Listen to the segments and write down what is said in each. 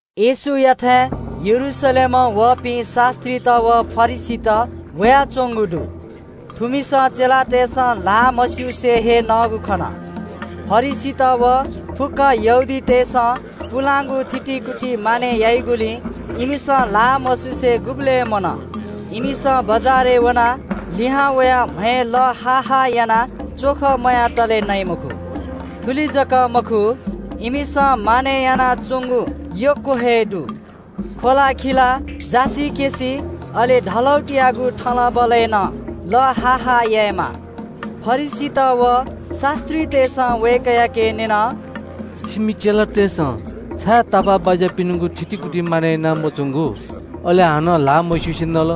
येशूयाथाय् यरूशलेमं वःपिं शास्‍त्रीत व फरिसीत वयाच्‍वंगु दु। थुमिसं चेलातय्‌सं ल्‍हाः मस्‍युसे हे नःगु खन। फरिसीत व फुक्‍क यहूदीतय्‌सं पुलांगु थितिकुति मानय् याइगुलिं इमिसं ल्‍हाः मस्‍युसे गुबलें मनः। इमिसं बजारय् वनाः लिहां वयाः म्‍हय् लः हा हा यानाः थःत च्‍वख मयातले नइ मखु। थुलि जक मखु, इमिसं मानय् यानाच्‍वंगु यक्‍व हे दु – ख्‍वलाखिला, जासिकेँसि, अले कँय्‌यागु थलबलय् नं लः हा हा यायेमाः। फरिसीत व शास्‍त्रीतय्‌सं वय्‌कःयाके न्‍यन – “छिमि चेलातय्‌सं छाय् तापाःबाज्‍यापिनिगु थितिकुति मानय् याना मच्‍वंगु, अले हानं ल्‍हाः मस्‍युसे नल?”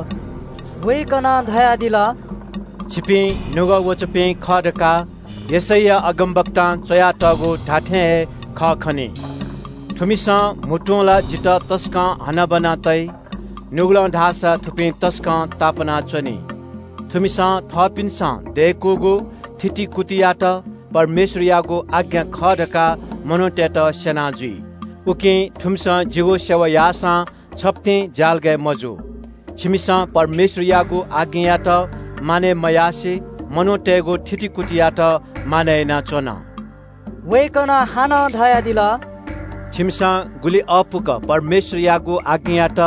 वय्‌कलं धयादिल – “छिपिं निपाः ख्‍वाःपाः दुपिं खः धकाः यशैया अगमवक्तां च्‍वयातःगु धात्‍थें हे खः खनी – “‘थुमिसं म्‍हुतुं ला जितः तसकं हनाबना तइ। नुगलं धाःसा थुपिं तसकं तापाना च्‍वनी। थुमिसं थःपिन्‍सं दय्‌कूगु थितिकुतियात परमेश्‍वरयागु आज्ञा खः धकाः मनूतय्‌त स्‍यना जुइ। उकिं थुमिसं जिगु सेवा याःसां छप्‍तिं ज्‍यालगय् मजू।’ “छिमिसं परमेश्‍वरयागु आज्ञायात मानय् मयासें मनूतय्‌गु थितिकुतियात मानय् यानाच्‍वन।” वय्‌कलं हानं धयादिल – “छिमिसं गुलि अःपुक परमेश्‍वरयागु आज्ञायात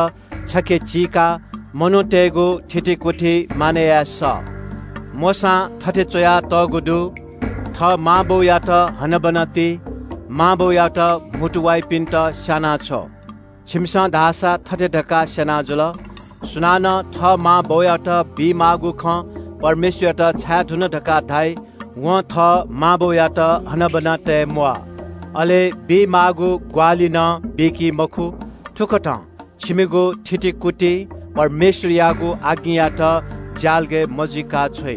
छखे चीकाः मनूतय्‌गु थितिकुति मानय् याये सः। मोशां थथे च्‍वयातःगु दु – ‘थः मां बौयात हनाबना ति। मां बौयात म्‍हुतु वाइपिन्‍त स्‍यानाछ्व।’ छिमिसं धाःसा थथे धकाः स्‍यना जुल – ‘सुनानं थः मां बौयात बीमाःगु खँ परमेश्‍वरयात छाये धुन धकाः धाइ (थुकियात कुर्बान धाइ) वं थः मां बौयात हनाबना तये म्‍वाः, अले बीमाःगु ग्‍वाहालि नं बीकी मखु।’ थुकथं छिमिगु थितिकुतिं परमेश्‍वरयागु आज्ञायात ज्‍यालगय् मजुइका छ्वइ।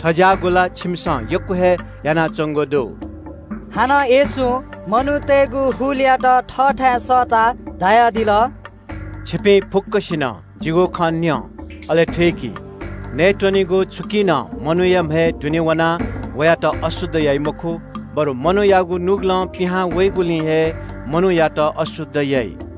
थज्‍याःगु ला छिमिसं यक्‍व हे यानाच्‍वंगु दु।” हानं येशूं मनूतय्‌गु हुलयात थःथाय् सःताः धयादिल – “छिपिं फुक्‍कसिनं जिगु खँ न्‍यँ, अले थुइकि। नयेत्‍वनेगु छुकिं नं मनूया म्‍हय् दुने वनाः वयात अशुद्ध याइ मखु, बरु मनूयागु नुगलं पिहां वइगुलिं हे मनूयात अशुद्ध याइ।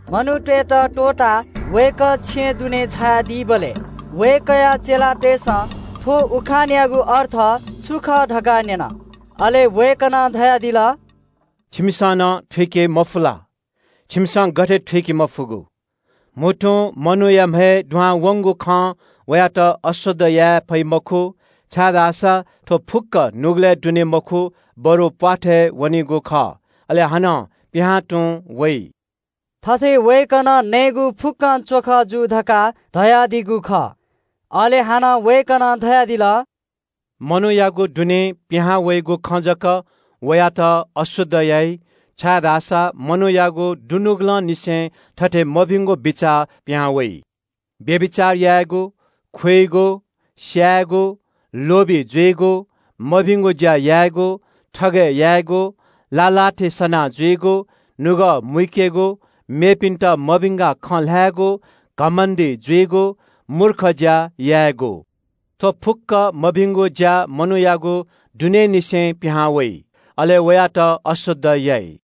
मनूतय्‌त त्‍वःताः वय्‌कः छेँय् दुने झायादीबलय् वय्‌कःया चेलातय्‌सं थ्‍व उखानयागु अर्थ छु खः धकाः न्‍यन। अले वय्‌कलं धयादिल – “छिमिसं नं थुइके मफु ला? छिमिसं गथे थुइके मफुगु? म्‍हुतुं मनूया म्‍हय् दुहां वंगु खं वयात अशुद्ध याये फइ मखु। छाय्‌धाःसा थ्‍व फुक्‍क नुगलय् दुने मखु, बरु प्‍वाथय् वनीगु खः, अले हानं पिहां तुं वइ।” (थथे वय्‌कलं नयेगु फुक्‍क च्‍वख जू धकाः धयादीगु खः) अले हानं वय्‌कलं धयादिल – “मनूयागु दुनें पिहांवइगु खं जक वयात अशुद्ध याइ, छाय्‌धाःसा मनूयागु दुनुगलंनिसें थथे मभिंगु बिचाः पिहां वइ – व्‍यभिचार यायेगु, खुइगु, स्‍यायेगु, लोभी जुइगु, मभिंगु ज्‍या यायेगु, थगय् यायेगु, लाः लाः थें सनाः जुइगु, नुगः मुइकेगु, मेपिन्‍त मभिंकाः खँ ल्‍हायेगु, घमण्‍डी जुइगु, मूर्ख ज्‍या यायेगु। थ्‍व फुक्‍क मभिंगु ज्‍या मनूयागु दुनेंनिसें पिहां वइ, अले वयात अशुद्ध याइ।”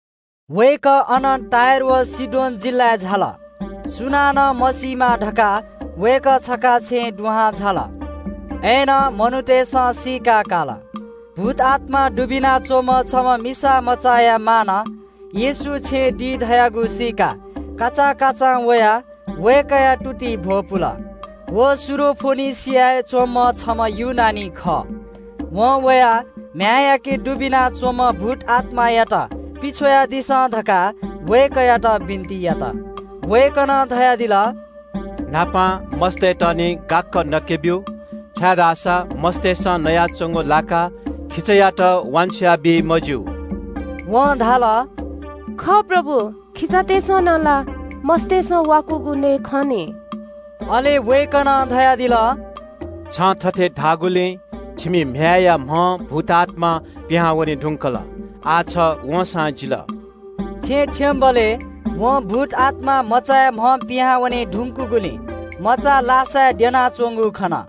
वय्‌कः अनं टुरोस व सीदोन जिल्‍लाय् झाल। सुनानं मसीमा धकाः वय्‌कः छखा छेँय् दुहां झाल। अय्‌नं मनूतय्‌सं सीकाकाल। भूतआत्‍मा दुबिना च्‍वंम्‍ह छम्‍ह मिसामचाया मांनं येशू छेँय् दी धयागु सीकाः काचाकाचां वयाः वय्‌कःया तुतिइ भ्‍वपुल। व सिरियाया फोनिकेय् च्‍वंम्‍ह छम्‍ह ग्रीक खः। वं वया म्‍ह्याय्‌याके दुबिना च्‍वंम्‍ह भूतआत्‍मायात पिछ्वयादिसँ धकाः वय्‌कःयात बिन्‍ति यात। वय्‌कलं धयादिल – “न्‍हापां मस्‍तय्‌त निं गाक्‍क नके ब्‍यु, छाय्‌धाःसा मस्‍तय्‌सं नयाच्‍वंगु लाकाः खिचायात वान्‍छ्वया बी मज्‍यू।” वं धाल – “खः प्रभु, खिचातय्‌सं नं ला मस्‍तय्‌सं वाकूगु नये खं निं।” अले वय्‌कलं धयादिल – “छं थथे धाःगुलिं छिमि म्‍ह्याय्‌या म्‍हं भूतआत्‍मा पिहां वने धुंकल, आः छ वंसां जिल।” छेँ थ्‍यंबलय् वं भूतआत्‍मा मचाया म्‍हं पिहां वने धुंकूगुलिं मचा लासाय् द्यनाच्‍वंगु खन।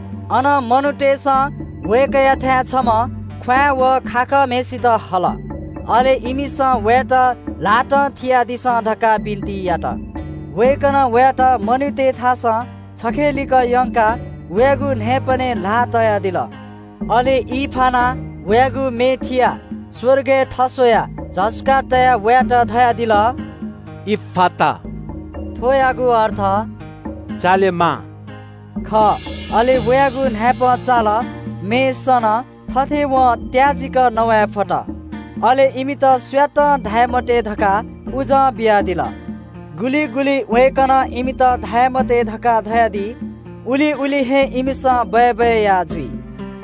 अन मनूतय्‌सं वय्‌कःयाथाय् छम्‍ह ख्‍वाँय् व खाखःम्‍हय्‌सित हल, अले इमिसं वयात ल्‍हातं थियादिसँ धकाः बिन्‍ति यात। वय्‌कलं वयात मनूतय्‌थासं छखेलिक यंकाः वयागु न्‍हाय्‌पनय् ल्‍हाः तयादिल। अले ई फानाः वयागु मे थियाः स्‍वर्गय् थस्‍वयाः झसुकाः तयाः वयात धयादिल – “इफ्‍फात!” थुकियागु अर्थ खः – “चालेमा!” अले वयागु न्‍हाय्‌पं चाल, मे सन, थथे वं त्‍याजिक नवाये फत। अले “इमित सुयातं धाये मते” धकाः उजं बियादिल। गुलि गुलि वय्‌कलं इमित धाये मते धकाः धयादी, उलि उलि हे इमिसं बय्‌बय् याः जुइ।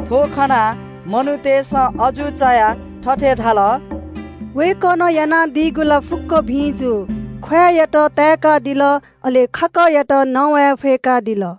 थ्‍व खनाः मनूतय्‌सं अजू चायाः थथे धाल – “वय्‌कलं यानादीगु ला फुक्‍कं भिं जू, ख्‍वाँय्‌यात ताय्‌कादिल, अले खाखःयात नवाये फय्‌कादिल।”